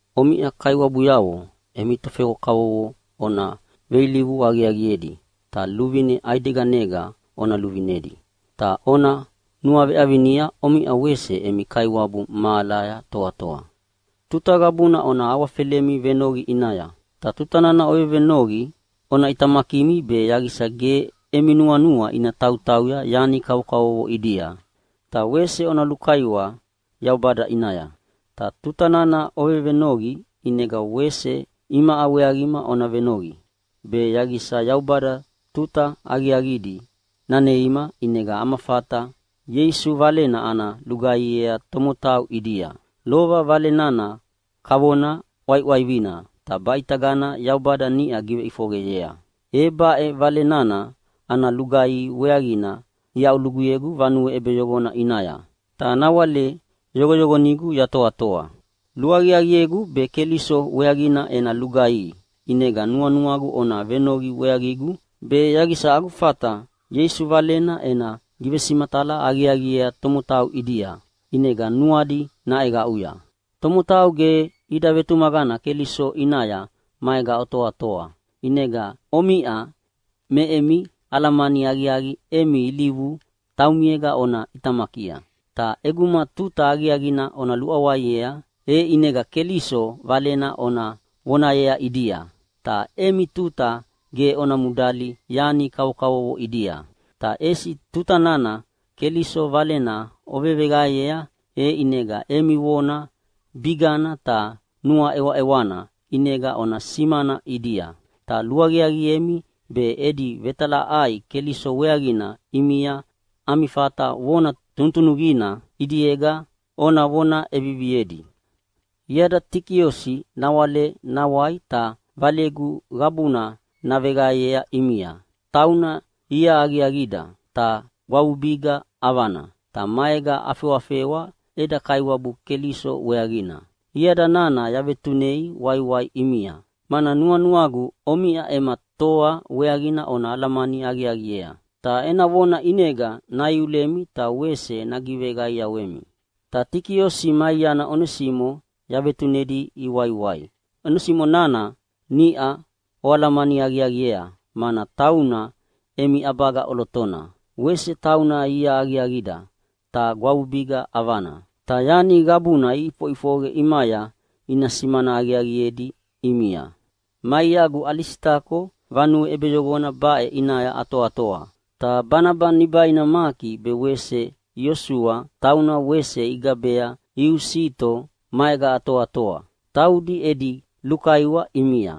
Omiʼa kaiwabuyavo emi tofewa kavovo ona veilivu aqiaqiedi ta luvine ʼaideganega ona luvinedi. Ta ona nuaveʼavinia omiʼa wese emi Kaiwabu mahalaya toatoa. Tuta qabuna ona awafelemi venoqi ʼinaya. Ta tuta nana ovevenoqi ona ʼitamakimi be yaqisa ge emi nuanua ina tautauya yani kavokavovo ʼidia. Ta wese ona lukaiwa Yaubada ʼinaya. Ta tuta nana ovevenoqi ʼinega wese imaʼa weaqima ona venoqi, be yaqisa Yaubada tuta aqiaqidi naneima ʼinega ana fata Ieisu Valena ana lugaihiea tomotau ʼidia. Lova Vale nana kavona ʼwaiʼwaivina ta baʼitagana Yaubada niʼa giveʼifoqeyea. E baʼe Vale nana ana lugaihi weaqina iaʼuluguyegu vanue ʼebeyoqona ʼinaya, ta nawale yoqoyoqonigu yatoatoa. Luaqiaqiegu be Keliso weaqina ena lugaihi. ʼInega nuanuagu ona venoqi weaqigu, be yaqisa agu fata Ieisu Valena ena givesimatala aqiaqiea tomotau ʼidia, ʼinega nuadi naʼeqaʼuya. Tomotau ge ida vetumaqana Keliso ʼinaya maega otoatoa, ʼinega omiʼa me emi alamani aqiaqi emi ilivu taumiega ona ʼitamakia. Ta ʼeguma tuta aqiaqina ona luʼawaiea, e ʼinega Keliso Valena ona vonayea ʼidia, ta emi tuta ge ona mudali yani kavokavovo ʼidia. Ta ʼesi tuta nana Keliso Valena oveveqaeyea, e ʼinega emi vona bigana ta nuaʼewaʼewana ʼinega ona simana ʼidia. Ta luaqiaqiemi be edi vetalaʼai Keliso weaqina ʼimia ami fata vona tunutunuqina ʼidiega ona vona ʼeviviedi. Iada Tikiosi nawale nawai ta valegu qabuna naveqaeyea ʼimia. Tauna ia aqiaqida ta gwavubiga ʼavana, ta maega afewafewa eda Kaiwabu Keliso weaqina. Iada nana yavetunei waiwai ʼimia, mana nuanuagu omiʼa ema toa weaqina ona alamani aqiaqiea. Ta ena vona ʼinega naiulemi ta wese nagiveqaiawemi. Ta Tikiosi ma iana Onesimo yavetunedi iwaiwai. Onesimo nana niʼa oalamani aqiaqiea, mana tauna emi ʼabaga ʼolotona. Wese tauna ia aqiaqida ta gwavubiga ʼavana. Ta yani qabuna iʼifoʼifoqe ʼimaya ina simana aqiaqiedi ʼimia. Ma iagu Alisitako vanue ʼebeyoqona baʼe ʼinaya atoatoa. Ta Banaba nibaina Maki be wese Iosua tauna wese igabea Iusito maega atoatoa. Taudi edi lukaiwa ʼimia.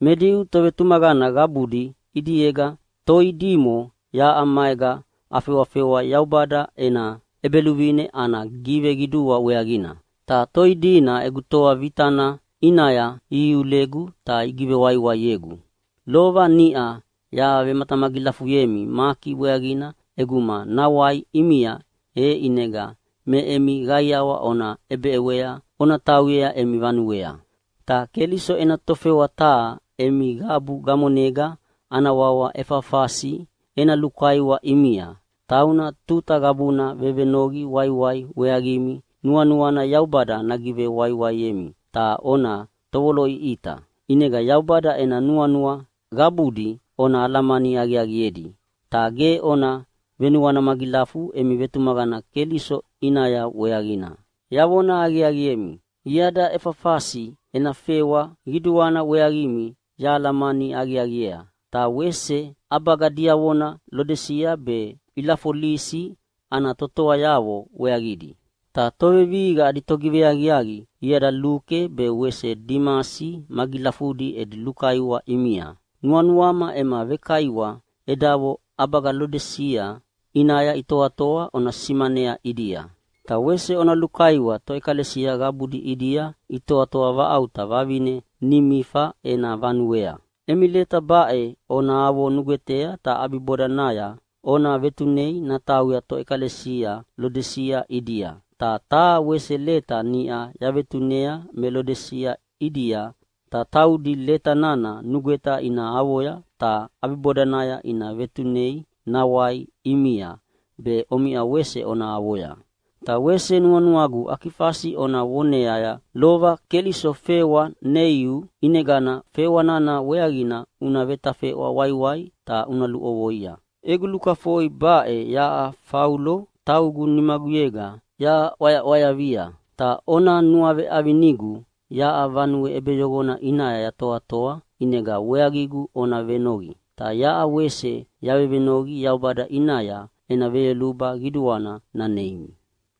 Me Diu tovetumaqana qabudi ʼidiega toidimo yaʼa maega afewafewa Yaubada ena ʼEbeluvine ana giveqidua weaqina. Ta toidina egu toa vitana ʼinaya ihiulegu ta igivewaiwaiegu. (Lova niʼa yavematamagilafuyemi Maki weaqina ʼeguma nawai ʼimia, e ʼinega me emi qaiawa ona ʼebeʼewei ona tauyea emi vanuea.) Ta Keliso ena tofewa taha emi qabu gamonega ana wawa Efafasi ena lukaiwa ʼimia. Tauna tuta qabuna vevenoqi waiwai weaqimi, nuanuana Yaubada nagivewaiwaiemi ta ona tovoloʼiʼita. ʼInega Yaubada ena nuanua qabudi ona alamani aqiaqiedi, ta ge ona venuana magilafu emi vetumaqana Keliso ʼinaya weaqina. Yavona aqiaqiemi, iada Efafasi ena fewa qiduana weaqimi yahalamani aqiaqiea, ta wese ʼabagadiavo Lodisia be Ilafolisi ana totoayavo weaqidi. Ta tovevihiqa adi togiveaqiaqi iada Luke be wese Dimasi magilafudi edi lukaiwa ʼimia. Nuanuama ema vekaiwa edavo ʼabaga Lodisia ʼinaya itoatoa ona simanea ʼidia, ta wese ona lukaiwa toʼekalesia qabudi ʼidia itoatoa vaʼauta vavine Nimifa ena vanuea. Emi leta baʼe ona avo nugwetea, ta ʼabibodanaya ona vetunei natauya toʼekalesia Lodisia ʼidia. Ta taha wese leta niʼa yavetunei me Lodisia ʼidia, ta taudi leta nana nugweta ina avoya, ta ʼabibodanaya ina vetunei nawai ʼimia be omiʼa wese ona avoya. Ta wese nuanuagu Akifasi ona voneaya, “Lova Keliso fewa neiu, ʼinegana fewa nana weaqina una vetafeʼwa waiwai ta una luʼovoia.” Egu lukafoi baʼe yaʼa Faulo taugu nimaguyega yaʼwayaʼwayavia. Ta ona nuaveʼavinigu yaʼa vanue ʼebeyoqona ʼinaya yatoatoa ʼinega weaqigu ona venoqi. Ta yaʼa wese yavevenoqi Yaubada ʼinaya ena veyoluba qiduana naneimi.